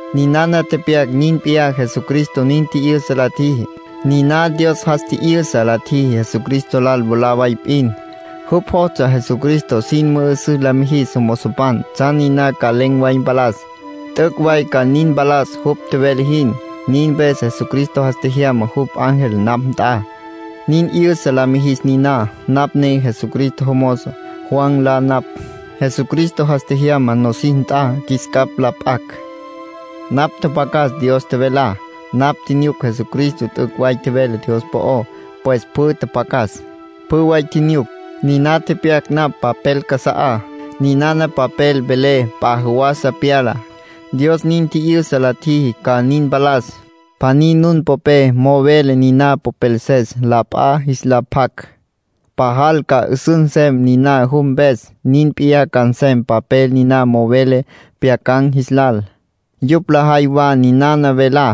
Ninana tepyac nin p'iyá Jesucristo nin tji'yüsa la tjiji. Niná Dios jas tji'yüsa la tjiji Jesucristo lal mwalá way p'in. Jupj jostsja Jesucristo sin mü'ü'süs la mijis jomozopan tsjan niná ca len̈ way mpalas. T'üc' way ca nin mpalas jupj tjevele jin. Nin mpes Jesucristo jas tjejyama jupj ángel napj nt'a, nin 'yüsa la mijis niná. Napj ne Jesucristo jomozo. Juan nlá napj. Dios Jesucristo jas tjejyama nosis nt'a qjuis capj la p'acj. Napj tjapjacas Dios tjevelá. Napj tjinyuc Jesucristo t'üc' way tjevele Dios po'ó. Pues pjü tjapjacas, pjü way tjinyuc, niná tepyac napj papel casa'á. Ninana papel vele p'a jawasa pyalá. Dios nin tji'yüsa la tjiji ca nin mpalas. Pjaní nun popé mo'o vele niná popelses la p'a jis la pjac, pajal ca 'üsüs nsem niná jupj mpes. Nin p'iyá ca nsem papel niná mo'o vele pjyacan̈ jis lal. Yupj lajay wa ninana velá,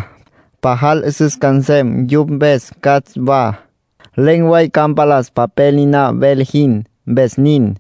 pajal 'üsüs ca nsem yupj mpes catsj wa. Len̈ way ca mpalas papel niná vele jin, mpes nin.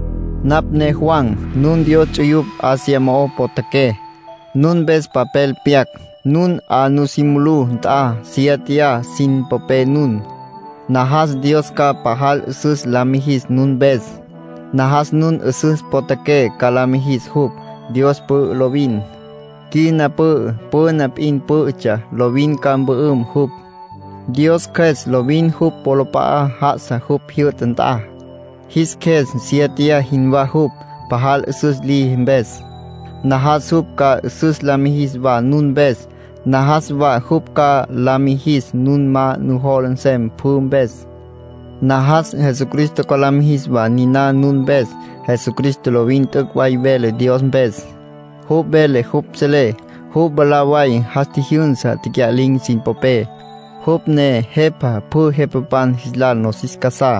Napj ne Juan. Nun Dios ts'uyupj Asia mo'o potjaqué, nun mpes papel pyac. Nun 'a nusí mulú nt'a siéteya sin popé nun. Najas Dios ca pajal 'üsüs la mijis nun mpes. Najas nun 'üsüs potjaqué ca la mijis jupj. Dios pü'ü lovin. Quina pü'ü, püna p'in pǘ'ütsja, lovin ca mpü'üm jupj. Dios Cjües lovin jupj wolap'a'a já'asa jupj jyü'ta nt'a. Jis qjues siéteya jinwá jupj, pajal 'üsüs liji mpes. Najas jupj ca 'üsüs la mijis wa nun mpes. Najas wa jupj ca la mijis nun ma nujola nsem pjü mpes. Najas Jesucristo ca la mijis wa niná nun mpes. Jesucristo lovin t'üc' way vele Dios mpes. Jupj vele jupj selé. Jupj mwalá way jas tjijyünsá tecya'lin̈ sin popé. Jupj ne Jepa pjü jepapan jis lal nosis casá.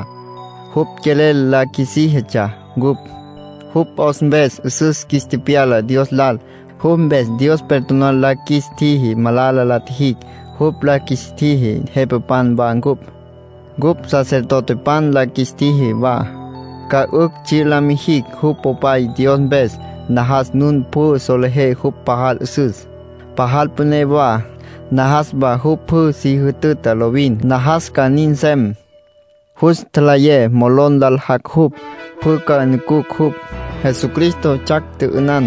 Jupj quelel la qjuisíjitsja ncupj. Jupj 'os mpes 'üsüs qjuis tepyala Dios lal. Jupj mpes Dios perdonar la qjuis tjiji malala la tjijicj. Jupj la qjuis tjiji jepapan wa ncupj. Cupj sacerdotepan la qjuis tjiji wa, ca 'ücj tsji' la mijicj jupj Popay Dios mpes. Najas nun pjü solejé jupj pajal 'üsüs, pajal püné wa. Najas wa jupj pjü si jütüta lovin. Najas ca nin nsem. Jus tjalayé molon lal jac' jupj. Pjü ca nucucj jupj. Jesucristo 'atsjac, tjü'ünan,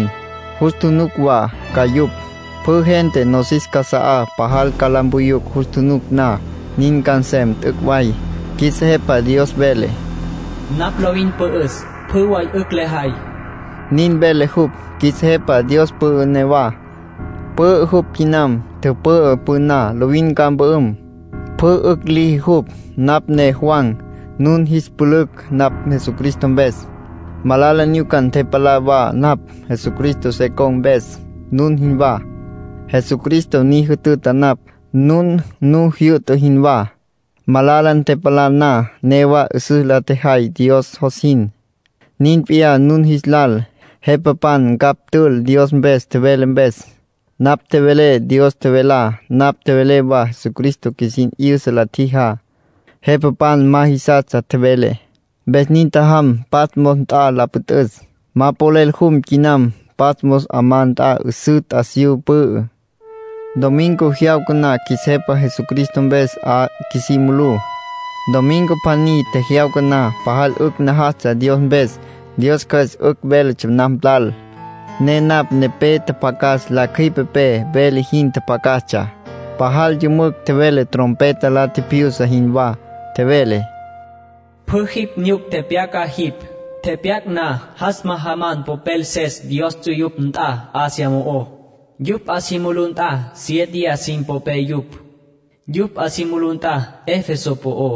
jus nucucj wa ca yupj. Pjü gente nosis casa'á pajal ca la mpuyucj jus tjunuc na. Nin ca nsem t'üc' way. Qjuis Jepa Dios vele: “Napj lovin pü'üs, pjü way 'ücj lejay”. Nin vele jupj. Qjuis Jepa Dios pü'ü newa. Pü'ü jupj quinam. Tüpü'ü püná. Lovin ca mpü'üm. Pjü 'ücj liji jupj. Napj ne Juan, nun jis pülücj napj Jesucristo mpes. Malala nyuca ntepalá wa napj, Jesucristo se con̈ mpes, nun jinwá. Jesucristo ni jütüta napj, nun nu jyü'ta jinwá. Malala ntepalá na, newa 'üsüs la tjejay Dios jos jin. Nin p'iyá nun jis lal. Jepapan ncapj tül Dios mpes tjevelé mpes. Napj tjevelé Dios tjevelá. Napj tjevelé wa Jesucristo qjuisin 'yüsa la tjijá. Jepapan ma jisastsja tjevelé, mpes nin tjajam Patmos nt'a la püt'üs. Ma polel jum quinam. Patmos 'amá nt'a 'üsǘ t'asiyú pü'ü. Domingo jyawca na qjuis Jepa Jesucristo mpes 'a qjuisí mulú. Domingo pjaní tjejyawca na, pajal 'ücj najastsja Dios mpes. Dios Cjües 'ücj véletsja napj lal, ne napj nepé tjapjacas la cjüipepé vele jin tjapjacastsja. Pajal yümücj tjevele trompeta la tjipjyusa jinwá. Tjevele: “Pjü jipj nyuc tepyaca jipj. Tepyac na, jas majaman popelses Dios ts'uyupj nt'a Asia mo'ó. Yupj 'a si mulú nt'a siéteya sin popé yupj. Yupj 'a si mulú nt'a Efeso po'ó,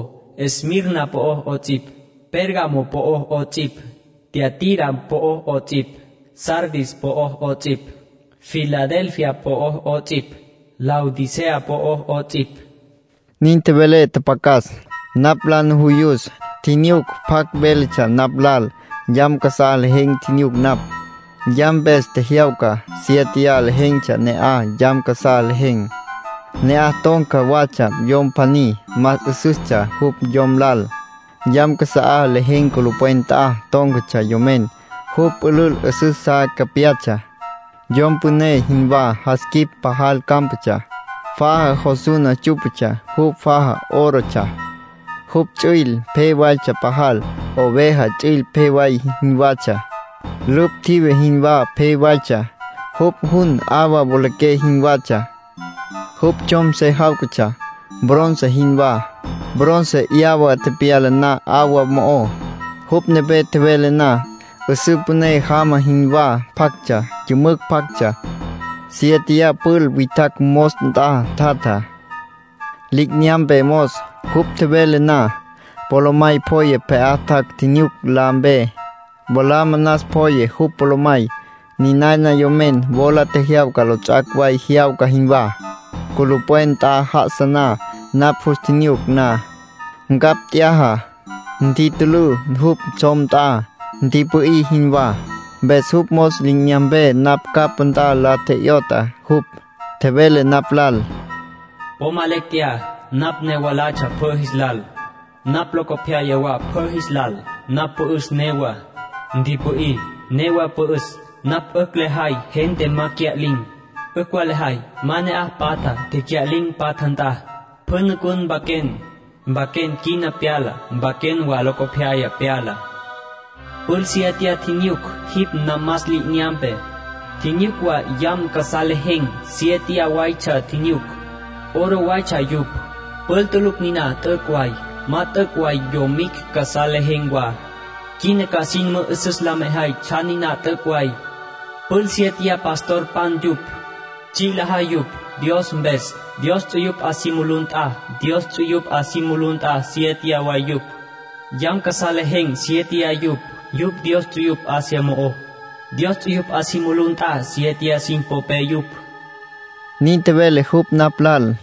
Esmirna po'ó 'ots'ipj, Pérgamo po'ó 'ots'ipj, Tiatira po'ó 'ots'ipj, Sardis po'ó 'ots'ipj, Filadelfia po'ó 'ots'ipj, Laodicea po'ó 'ots'ipj.” Nin tjevele tjapjacas. Napj la nujuyus, tjinyuc pjacj véletsja napj lal. Yam casá lejen̈ tjinyuc napj, yam mpes tjejyawca. Siéteya lejen̈tsja ne'aj yam casá lejen̈. Ne'aj ton̈ca watsja yom pjaní, más 'üsüstsja jupj yom lal. Yam casa'á lejen̈ culupwen nt'a tón̈catsja yomen. Jupj pülül 'üsüs sa capyatsja, yom püné jinwá. Jas quip pajal cámpatsja. Faja jos suna tsú'patsja, jupj faja órotsja. Jupj ts'üil pje waytsja pajal, oveja ts'üil pje way jinwatsja. Lüpj tjive jinwá pje waytsja. Jupj jun 'awa wolaqué jinwatsja. Jupj tsjom se jáwcatsja, bronce jinwá, bronce 'yawa tepyala na 'awa mo'ó. Jupj nepé tjevele na, 'üsǘ püné jama jinwá pjactsja, yümücj pjactsja. Siéteya pjul witjacj mos nt'a tjatja, li'inyampe mos. Jupj tjevele na, polomay pjoye pje'á tjac' tjinyuc la mpe. Wala manas pjoye jupj polomay. Ninana yomen wola tjejyawca lots'ac' way jyawca jinwá, culupwen nt'a já'asa na. Napj jus tjinyuc na, ncapj t'yaja, ntitülǘ jupj tsjom nt'a, ntipü'í jinwá. Mpes jupj mos li'inyampe napj capá nt'a la tje'yot'a jupj, tjevele napj lal: “Po ma lecj tjeyá. Napj ne mwalatsja pjü jis lal. Napj locopyaya wa pjü jis lal. Napj pü'üs newá. Ntipü'í, newa pü'üs. Napj 'ücj lejay gente ma cya'lin̈. 'Ücj wa lejay ma ne'aj patja, tecya'lin̈ patja nt'a. Pjü nucun mpaquen. Mpaquen quina pyalá. Mpaquen wa locopyaya pyalá. Pjul siéteya tjinyuc jipj namas li'inyampé. Tjinyuc wa yam casá lejen̈, siéteya waytsja tjinyuc. Oro waytsja yupj. Pjul tulucj niná t'üc' way, ma t'üc' way yomicj casá lejen̈ wa. Quina ca jin mü'üsüs la mejay tsjan niná t'üc' way. Pjul siéteya pastorpan yupj. Tsji' lajay yupj Dios mpes Dios ts'uyupj 'a si mulú nt'a, Dios ts'uyupj 'a si mulú nt'a siéteya way yupj. Yam casá lejen̈ siéteya yupj, yupj Dios ts'uyupj Asia mo'ó. Dios ts'uyupj 'a si mulú nt'a siéteya sin popé yupj”, nin tjevele jupj napj lal.